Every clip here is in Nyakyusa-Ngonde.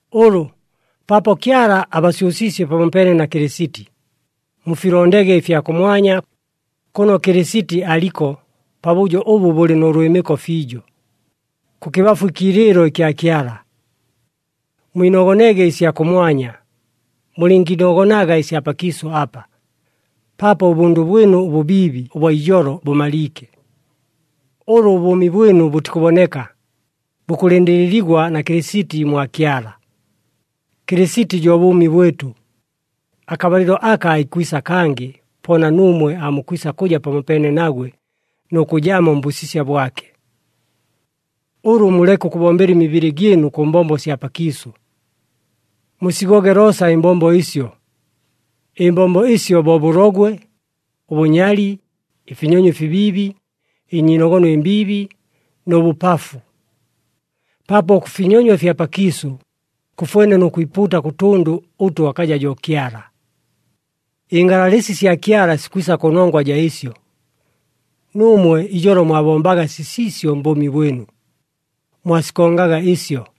Ʉlʉ, paapo Kyala abasyʉsiisye pamopeene na Kɨlɨsiti, mufilondege ɨfya kʉmwanya, kʉno Kɨlɨsiti aliko pabʉjo ʉbʉ bʉlɨ nʉ lwɨmɨko fiijo, kʉkɨbafu ɨkiilɨɨlo ɨkya Kyala. Mwinogonege ɨsya kʉmwanya, mulɨngiinogonaga ɨsya pakiisʉ apa, paapo ʉbʉndʉ bwɨnu ʉbʉbiibi ʉbwa ijolo bʉmaliike. Ʉlʉ ʉbʉʉmi bwɨnu bʉtikʉboneka, bukʉlɨndɨlɨligwa na Kɨlɨsiti mwa Kyala. Kɨlɨsiti jo bʉʉmi bwɨtʉ. Akabalɨlo aka aikwisa kangɨ, po na nuumwe aamukwisa kʉja pamopeene nagwe nʉ kʉjamo mbʉsisya bwake. Ʉlʉ muleke ʉkʉbombela ɨmibɨlɨ gyɨnu kʉ mbombo sya pakiisʉ. Musigoge loosa ɨmbombo ɨsyo! Ɨmbombo ɨsyo bo bʉlogwe, ʉbʉnyali, ɨfinyonyo ɨfibiibi, ɨnyiinogono ɨmbiibi nʉ bʉpafu. Paapo ʉkʉfinyonywa ɨfya pakiisʉ, kʉfwene nʉ kwipuuta kʉ tʉndʉ ʉtʉ akaja jo Kyala. Ɨngalalɨsi sya Kyala sikwisa kʉnongwa jaa ɨsyo. Nuumwe ijolo mwabombaga sisiisyo mbʉʉmi bwɨnu, mwasikongaga ɨsyo,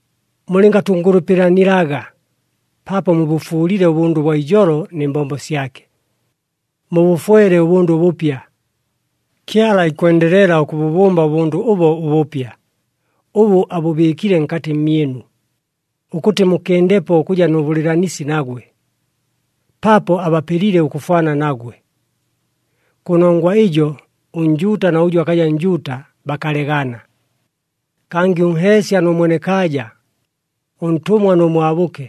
Mulɨngatʉngʉlʉpɨlanilaga, paapo mubʉfuulile ʉbʉndʉ ʉbwa ijolo nɨ mbombo syake, mubʉfwele ʉbʉndʉ ʉbʉpya. Kyala ikwendelela ʉkʉbʉbʉmba ʉbʉndʉ ʉbo ʉbʉpya, ʉbʉ abʉbɨɨkile nkatɨ mmyɨnu, ʉkʉtɨ mukɨndepo ʉkʉja nʉ bʉlɨɨlanisi nagwe, paapo abapelile ʉkʉfwana nagwe. Kʉnongwa ɨjo, ʉNjuuta na ʉjʉ akaja Njuuta bakalegana, kangɨ ʉnheesya nʉ mwenekaaja, ʉntʉmwa nʉ mwabʉke.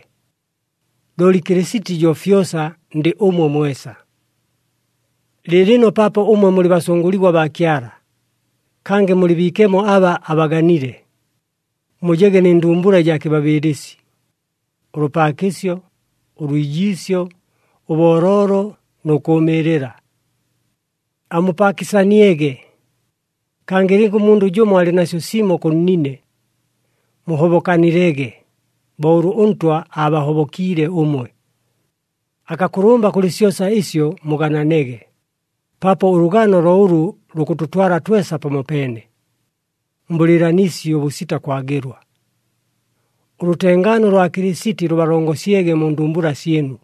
Looli Kɨlɨsiti jo fyosa, ndɨ ʉmwe mwesa. Lɨɨlɨno paapo ʉmwe mulɨ basʉngʉligwa baa Kyala, kangɨ mulɨ biikemo aba abaganile, mujege nɨ ndumbula ɨjaa kɨbabɨɨlɨsi, ʉlʉpaakɨsyo, ʉlwijiisyo, ʉbooloolo nʉ kʉʉmɨɨlɨla. Amupaakɨsaniege, kangɨ lɨnga ʉmundʉ jʉmo alɨ nasyo simo kʉ nnine, muhobokanilege, bo ʉlʉ ʉNtwa aabahobokiile ʉmwe. Akakʉlʉmba kʉlɨ syosa ɨsyo mugananege, paapo ʉlʉgano lo ʉlʉ lukʉtʉtwala twesa pamopeene, mbʉlɨɨlanisi ʉbʉsita kwagɨlwa. Ʉlʉtengaano lwa Kɨlɨsiti lʉbalongosyege mu ndumbula syɨnu.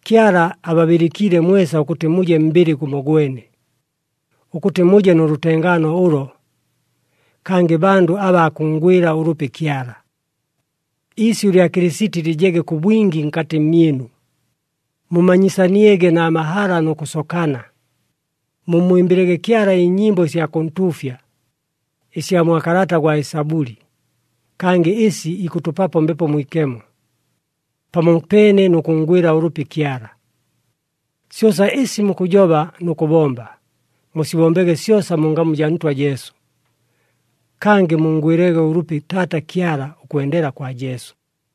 Kyala ababɨlɨkiile mwesa ʉkʉtɨ muje mbɨlɨ gʉmogwene, ʉkʉtɨ muje nʉ lʉtengaano ʉlo, kangɨ bandʉ abaa kʉnngwɨla ʉlʉpi Kyala. Iisyʉ lya Kɨlɨsiti lɨjege kʉ bwingi nkatɨ mmyɨnu. Mumanyisaniege na mahala, nʉ kʉsokana. Mummwɨmbɨlege Kyala ɨnyɨmbo ɨsya kʉntuufya, ɨsya mwa kalata gwa Ɨsabʉli, kangɨ ɨsi ikʉtʉpapo Mbepo Mwikemo, pamopeene nʉ kʉnngwɨla ʉlʉpi Kyala. Syosa ɨsi mukʉjoba nʉ kʉbomba, musibombege syosa mu ngamu jaa Ntwa Jesu. Kangɨ munngwɨlege ʉlʉpi Taata Kyala ʉkwendela kwa Jesu.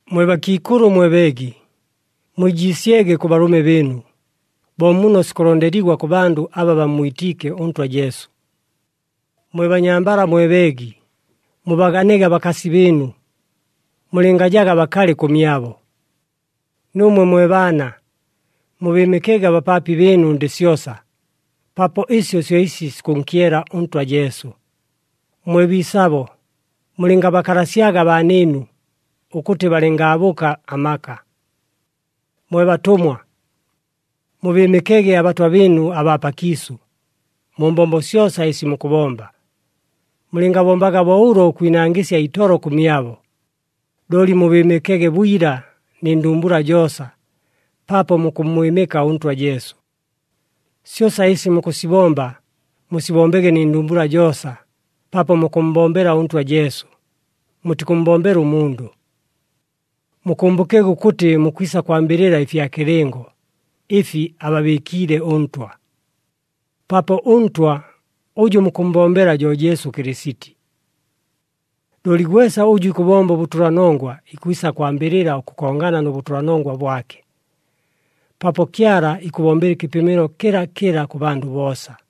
Mwe bakiikʉlʉ mwe beegi, mwijiisyege kʉ balʉme bɨɨnu, bo muno sikʉlondeligwa kʉ bandʉ aba bammwitiike ʉNtwa Jesu. Mwe banyambala mwe beegi, mubaganege abakasi bɨɨnu, mulɨngajaga bakalɨ kʉmyabo. Nuumwe mwe baana, mubɨɨmɨkege abapaapi bɨɨnu ndɨ syosa, paapo ɨsyo syo ɨsi sikʉnkyela ʉNtwa Jesu. Mwe biisabo, mulɨngabakalasyaga abaanɨɨnu, ʉkʉtɨ balɨngaabʉka amaka. Mwe batʉmwa, mubɨɨmɨkege abatwa bɨɨnu abaa pakiisʉ, mu mbombo syosa ɨsi mukʉbomba. Mulɨngabombaga bo ʉlo ʉkwinangɨsya itolo kʉmyabo, looli mubɨɨmɨkege bwila, nɨ ndumbula joosa, paapo mukʉmmwɨmɨka ʉNtwa Jesu. Syosa ɨsi mukʉsibomba, musibombege nɨ ndumbula joosa, paapo mukʉmmbombela ʉNtwa Jesu, mutikʉmmbombela ʉmundʉ. Mukʉmbʉkege ʉkʉtɨ mukwisa kwambɨlɨla ɨfya kɨlɨngo, ɨfi ababɨɨkiile ʉNtwa, paapo ʉNtwa ʉjʉ mukʉmmbombela jo Jesu Kɨlɨsiti. Looli gwesa ʉjʉ ikʉbomba ʉbʉtʉlanongwa ikwisa kwambɨlɨla ʉkʉkongana nʉ bʉtʉlanongwa bwake, paapo Kyala ikʉbombela ɨkɨpɨmɨlo kɨlakɨla kʉ bandʉ boosa.